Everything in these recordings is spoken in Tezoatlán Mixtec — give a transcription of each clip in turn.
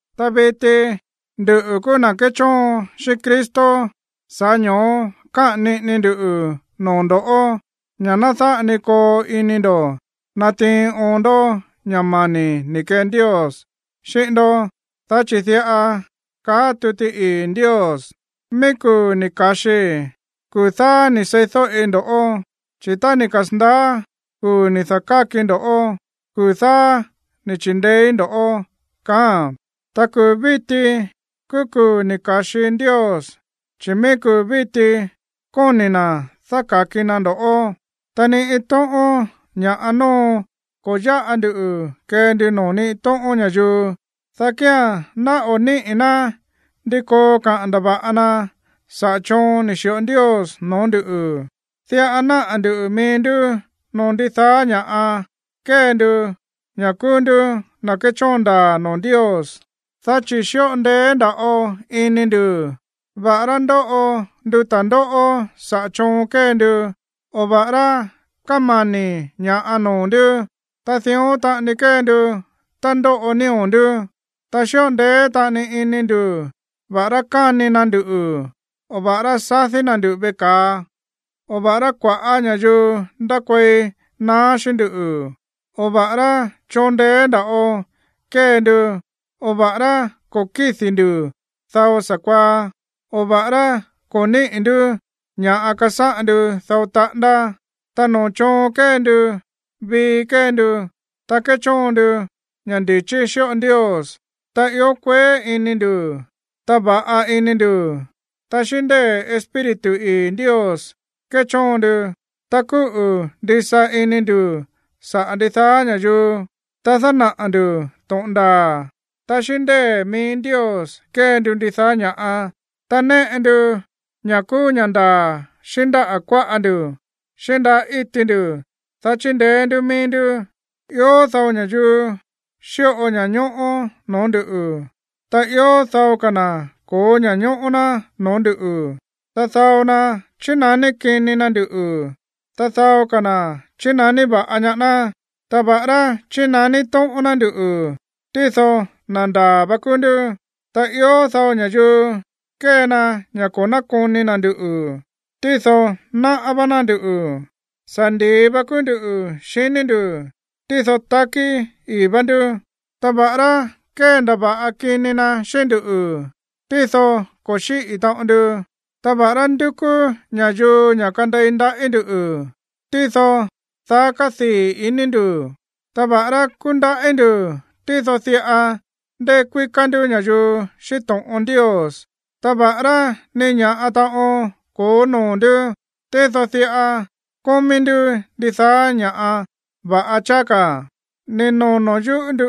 Ta viti nduꞌu̱ kúú na̱ kéchóon xíꞌín Cristo, sa̱ꞌá ño̱ó káꞌa̱n niꞌini ndu noo̱ ndo̱ ña̱ ná dáꞌa ni koo ini ndo̱ natiin oon ndó ña̱ mani̱ ni̱ kee Ndios xíꞌín ndó. Dá chi̱ diꞌa kaá tuti ii̱ Ndios: Mií kuu̱ ni̱ ka̱xii, kuu̱ dáá ni̱ seídóꞌi ndo̱ꞌó. Chi̱ tá ni̱ kasa̱ndaá kuu̱ ni̱ da̱kákii ndo̱ꞌó, kuu̱ dáá ni̱ chi̱ndeéí ndo̱ꞌó. Ta kuu̱ víti kúú kuu̱ ni̱ ka̱xi Ndios, chi̱ mií kuu̱ víti kóni̱ na̱ dáka̱ki na ndo̱ꞌó. Ta ni iin tóꞌón ña̱ꞌa nóo ko̱ yáꞌa ndu kee ndu noo̱ ni iin tóꞌón ña̱yuu, dá kía̱n ná o̱ níꞌi̱ ná ndi koo kaꞌa̱n ndava̱ꞌa na saꞌa̱ choon ni̱ xi̱ꞌo Ndios noo̱ ndú. Diꞌa náꞌa̱ ndu̱ mií ndú noo̱ ndidaá ña̱ kée ndu ña̱ kúú ndú na̱ kéchóon ndaa̱ noo̱ Ndios, dá chi̱ xíꞌo ndeé nda̱ꞌo ini ndu̱, va̱ꞌará ndóꞌo ndu ta̱ndóꞌó saꞌa̱ choon kée ndu, o va̱ꞌará kámani̱ ña̱ꞌa noo̱ ndú, ta dión taꞌani kée ndu tá ndóꞌo nío̱ ndú. Ta xíꞌo ndeé taꞌani ini ndu̱ va̱ꞌará káni na nduꞌu̱, o va̱ꞌará sadí na̱ nduꞌu̱ veꞌe ka̱a, o va̱ꞌará kua̱ꞌá ña̱yuu ndákuei naá xíꞌín ndú, o va̱ꞌará choon ndeé nda̱ꞌo kée ndu, o va̱ꞌará ko̱ kídi̱ ndu̱ dao sa̱kuaá, o va̱ꞌará ko̱ níꞌi̱ ndú ña̱ꞌa kasáꞌan ndu dao taꞌándá. Ta noo̱ choon kée ndu, vii kée ndu, ta kéchóon ndu ña̱ ndi̱chí xíꞌo Ndios, ta ió kueé ini ndu̱, ta va̱ꞌa ini ndu̱, ta xíꞌín ndée̱ Espíritu ii̱ Ndios kéchóon ndu, ta kúꞌu̱ ndisa ini ndu̱ saꞌa̱ ndidaá ña̱yuu, ta dánaꞌa̱ ndu̱ to̱ꞌon ndaa̱, ta xíꞌín ndée̱ mií Ndios kée ndu ndidaá ña̱ꞌa, ta néꞌe ndu ña̱ kúú ña̱ ndaa̱ xíꞌín ndáꞌa̱ kuáꞌa ndu̱, xíꞌín ndáꞌa̱ íti ndu̱, dá chindeé ndú mií ndú. Ió dao ña̱yuu xíꞌo ña̱ñóꞌó noo̱ ndú, ta ió dao ka̱ na̱ ko̱ó ña̱ñóꞌó ná noo̱ ndú. Ta dao na chínaní kini na nduꞌu̱, ta dao ka̱ na̱ chínaní va̱ꞌa ñaá ná. Ta va̱ꞌará chínaní tóꞌón ná nduꞌu̱, tído na̱ ndaa̱ va kúú ndú. Ta ió dao ña̱yuu kée na ña̱ ko̱ nákoni na̱ nduꞌu̱, tído náꞌá vá ná nduꞌu̱. Sa̱ ndi̱i va kúú ndú xiní ndu̱, tído takí ii̱ vá ndú. Ta va̱ꞌará kéndava̱ꞌa kini na xíꞌín nduꞌu̱, tído ko̱ xíꞌi̱ taꞌon ndu. Ta va̱ꞌará ndúkú ña̱yuu ña̱ kandei ndaꞌí ndu̱, tído daá kádii̱ iní ndu̱. Ta va̱ꞌará kúndaꞌí ndu̱, tído diꞌa ndekuíká ndú ña̱yuu xíꞌín to̱ꞌon Ndios. Ta va̱ꞌará ni ña̱ꞌa taꞌon ko̱ó noo̱ ndú, tído diꞌa kómí ndú ndidaá ña̱ va̱ꞌa cháá ka̱. Ni̱ nono̱ yúꞌu̱ ndú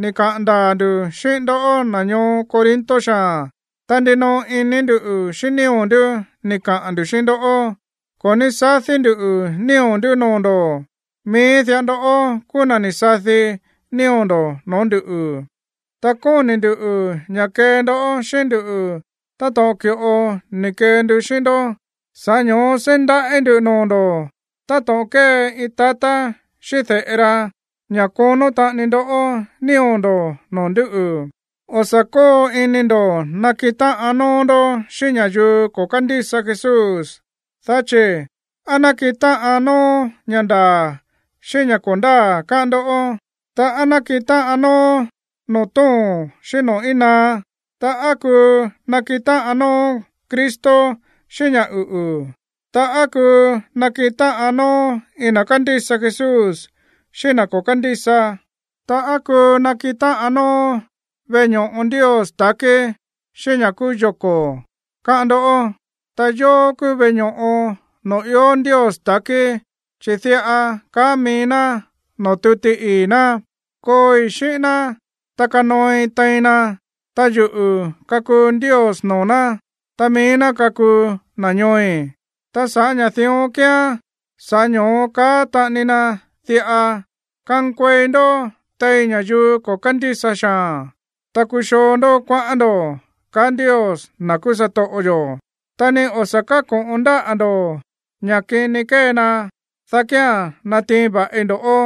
ni̱ kaꞌa̱n ndaa̱ ndu̱ xíꞌín ndó, na̱ ñoo Corinto xaa̱n, ta ndinoꞌo ini ndú xíꞌín nío̱ ndú ni̱ kaꞌa̱n ndu̱ xíꞌín ndó. Ko̱ ní sadí ndu̱ nío̱ ndú noo̱ ndo̱ꞌó, mií diꞌa ndó kúú na̱ ni̱ sadi nío̱ ndo̱ no̱ó nduꞌu̱. Ta kóni̱ ndu̱ ña̱ kee ndó xíꞌín ndú táto̱ꞌon ki̱ꞌo ni̱ kee ndu xíꞌín ndó, sa̱ꞌá ño̱ó seí ndaꞌí ndu̱ noo̱ ndo̱ táto̱ꞌon kée iin tatá xíꞌín de̱ꞌe ra ña̱ konó taꞌani ndó nío̱ ndo̱ noo̱ ndúꞌu̱. O̱ sa̱ kóo ini ndo̱ nakiꞌin táꞌan nóó ndó xíꞌín ña̱yuu ko̱ kándísa Jesús. Dá chi̱, ¿á nákiꞌin táꞌan nóó ña̱ ndaa̱ xíꞌín ña̱ ko̱ ndáa̱, káꞌán ndó? Ta, ¿á nákiꞌin táꞌan nóó noo̱ tóo̱n xíꞌín noo̱ íin naá? Ta, ¿á kuu nakiꞌin táꞌan nóó Cristo xíꞌín ña̱ uꞌu̱? Ta, ¿á kuu nakiꞌin táꞌan nóó iin na̱ kándísa Jesús xíꞌín iin na̱ ko̱ kándísa? Ta, ¿á kuu nakiꞌin táꞌan nóó veꞌe ño̱ꞌo Ndios ta̱kí xíꞌín ña̱ kúú yoko̱, káꞌán ndó? Ta yóó kúú veꞌe ño̱ꞌo noo̱ ió Ndios ta̱kí, chi̱ diꞌa kaá mií ná noo̱ tuti ii̱ ná: Kooi xíꞌín ná, ta kanooi tein na. Ta yuꞌu̱ kakuu Ndios noo̱ ná, ta mií ná kakuu na̱ ñooi̱. Ta sa̱ꞌá ña̱ dión kíán, sa̱ꞌá ño̱ó kaá taꞌani na diꞌa: Kankuei ndó tein ña̱yuu ko̱ kándísa xaa̱n, ta kuxoo ndó kuaꞌán ndo̱, kaá Ndios, na̱ kúú satoꞌo yo̱. Ta ni o̱ sa̱ káko̱ꞌon ndáꞌa̱ ndo̱ ña̱ kini kée na, dá kía̱n natiin va̱ꞌi ndo̱ꞌó.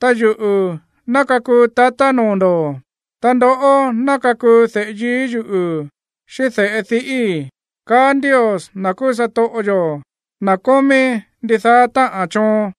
Ta yuꞌu̱ ná kakuu tatá noo̱ ndo̱, ta ndoꞌó ná kakuu de̱ꞌe yií yuꞌu̱ xíꞌín de̱ꞌe diꞌíi̱, kaá Ndios, na̱ kúú satoꞌo yo̱, na̱ kómí ndidaá táꞌa̱n choon.